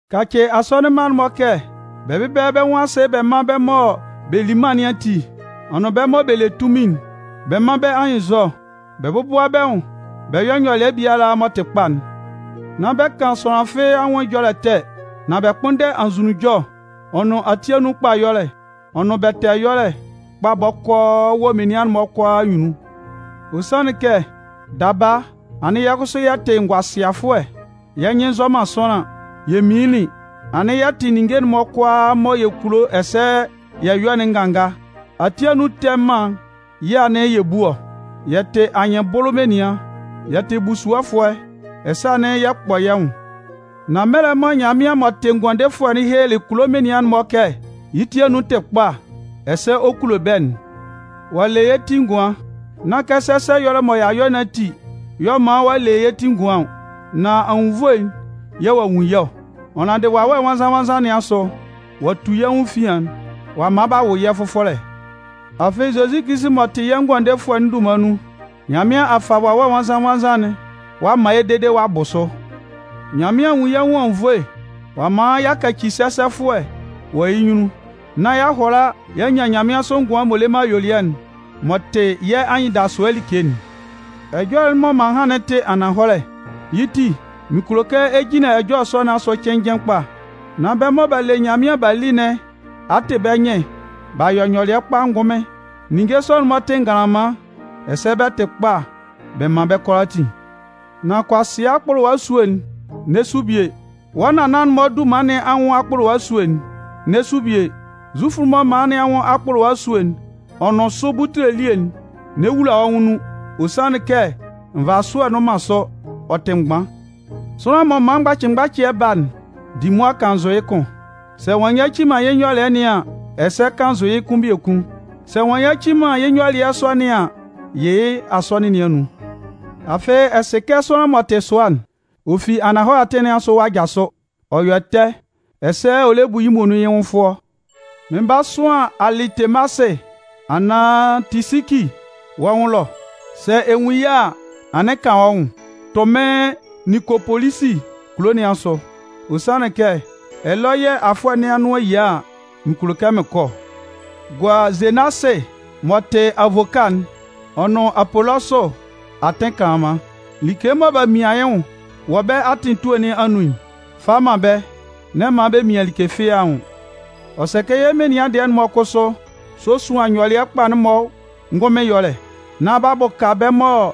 Kacɩ asɔnɩn mma'n-mɔ kɛ bɛ bɛ́bɛlɛ bɛ́ nwʋn asɩ bɛ mán bɛ́ mɔ bɛ lí mân nɩn ati ɔ nʋn bɛ́ mɔ bɛ le tunmin'n. Bɛ mán bɛ́ anyɩnnzɔ, bɛ bɔ́bʋa bɛ́ nwʋn bɛ yɔ́ nyɔlɩɛ biala m'ɔ tɩ kpa'n. Nán bɛ kan sʋanlan fɩ́ɩ́ anwʋn ɛjɔlɛ ɛtɛ, nan bɛ kpʋ́nndɛ anzʋnunjɔ'n, ɔ nʋn ati anun kpa ɛyɔlɛ'n ɔ nʋn bɛtɛɛ ɛyɔlɛ'n kpa bɔkɔɔ wɔ menian'n-mɔ kʋalaa anyunnun. Ɔ sanlɩn kɛ, daba, anɩn yɛ́ kʋsʋ yɛ tɩ ngʋasɩafʋɛ, yɛ́ nyɩn nzɔ man sʋanlan, yɛ minlinlin, anɩn yɛ tɩ ninnge'n-mɔ kʋalaa mɔ yɛ kulo ɛsɛ yɛ yɔ'n nganga. Ati anun ɛtɛ mân yɛ̂ anɩn yɛ bu ɔ, yɛ tɩ anyɩnbʋlʋ menian, yɛ tɩ busuɔfʋɛ ɛsɛ anɩn yɛ kpɔ yɛ́ nwʋn. Nan mɛlɛ mɔ Nyanmɩan m'ɔ tɩ Ngʋandefʋɛ'n helelɩ kulo menian'n-mɔ kɛ yɩ́ ti anun tɩ kpa ɛsɛ ɔ kulo bɛ́'n, ɔ'a le yɛ́ ti ngʋan. Nán kɛ sɛsɛ nyɔlɩɛ mɔ y'a yɔ ati y'ɔ man ɔ'a le yɛ́ ti ngʋan ɔ, nan anwunnvoe yɛ̂ ɔ'a nwun yɛ́ ɔ. Ɔ naandɩ Wawɛ Nwannzan-nwannzan nɩn asʋ ɔ'a tu yɛ́ nwʋn efian ɔ'a man b'a wʋ yɛ́ fʋfɔlɛ. Afɩ, Zozi Kilisi m'ɔ tɩ yɛ́ Ngʋandefʋɛ'n dunman nun, Nyanmɩan a fa Wawɛ Nwannzan-nwannzan'n ɔ'a man yɛ́ dede ɔ'a bʋ sʋ. Nyanmɩan a nwun yɛ́ nwʋn anwunnvoe ɔ'a man y'a kaci sɛsɛfʋɛ wɔ yɩ́ nyunnun, nán y'a hʋala y'a nyan nyanmɩansʋ ngʋan'n m'ɔ le man ayuelɩɛ'n m'ɔ tɩ yɛ́ anyɩndasʋɛ like'n. Ɛjɔlɛ'n mɔ m'an han'n tɩ ananhɔlɛ. Yɩ́ ti, mɩn kulo kɛ ɛ jinlan ɛjɔlɛ sɔ nɩn asʋ cɩnnjɩn kpa, nán bɛ́ mɔ b'a le Nyanmɩan b'a li nɩn a tɩ bɛ́ nyɩn b'a yɔ nyɔlɩɛ kpa ngʋnmɩn. Ninnge sɔ'n-mɔ tɩ nganlanman ɛsɛ bɛ tɩ kpa bɛ man bɛ́ kʋalaatin. Nan kʋasɩa akpʋlʋwa esúe'n, n'ɛ su bie. Wɔ́ nannan-mɔ dunman nɩn anwʋn akpʋlʋwa esúe'n, n'ɛ su bie. Zufʋ'n-mɔ mala nɩn anwʋn akpʋlʋwa esúe'n ɔ nʋn sʋ butule elie'n, n'ɛ wula wɔ́ nwʋn nun. Ɔ sanlɩn kɛ nvasʋɛ nnʋn man sʋ, ɔ tɩ mgban. Sʋanlan m'ɔ man mgbacɩmgbacɩɛ ba'n, di mʋa kannzʋ yɩ́ kʋn. Sɛ ɔ'a nyaci man yɩ́ nyɔlɩɛ nɩn an, ɛsɛ kannzʋ yɩ́ kʋn biekun. Sɛ ɔ'a nyaci man yɩ́ nyɔlɩɛ sɔ nɩn an, yɩ yɩ́ asɔnɩn nɩn anun. Afɩ, ɛ sɩ kɛ sʋanlan m'ɔ tɩ sʋa'n, ɔ fi ananhɔlɛ atɩn nɩn asʋ ɔ'a jasʋ, ɔ yɔ ɛtɛ, ɛsɛ ɔ lɛ bu yɩ́ muonun yɩ́ nwʋn fʋɔ. Mɩn 'ba sʋan Alɩtemasɩ anaan Tisiki wɔ́ nwʋn ɛlɔ. Sɛ ɛ nwun yɩ́ a, anɩn kan wɔ́ nwʋn tʋ mɩ́n Ninkopolisi kulo nɩn asʋ. Ɔ sanlɩn kɛ ɛlɔ yɛ̂ afʋɛ nɩn anʋan'n 'yia a, mɩn kulo kɛ mɩn kɔ ɔ. Gua Zenasɩ m'ɔ tɩ avoka'n ɔ nʋn Apolɔsʋ atɩn kanlanman. Like mɔ b'a mian yɩ́ nwʋn wɔ bɛ́ atɩn etue nɩn anun'n, fa man bɛ́, n'ɛ man bɛ mian like fɩ́ɩ́ nwʋn. Ɔ sɛ kɛ yɛ́ menian dɩɛ'n-mɔ kʋsʋ sósuan nyɔlɩɛ kpa'n-mɔ ngʋnmɩn ɛyɔlɛ, nán b'a bʋka bɛ́ mɔ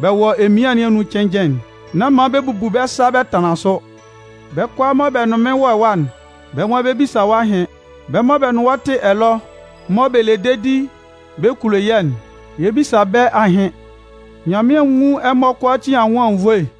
bɛ wɔ emian nɩn anun cɩnnjɩn'n. Nán man bɛ bubu bɛ́ sa bɛ tanlan sʋ. Bɛ́ kʋalaa mɔ bɛ nʋn mɩ́n wɔ ɛwa'n, bɛ́ nwan bɛ 'bisa wɔ́ ahɩn. Bɛ́ mɔ bɛ nʋn wɔ́ tɩ ɛlɔ, mɔ bɛ le dedi bɛ kulo yɛ́'n, yɛ 'bisa bɛ́ ahɩn. Nyanmɩan nwún ɛmɔ kʋalaatin anwʋn anwunnvoe.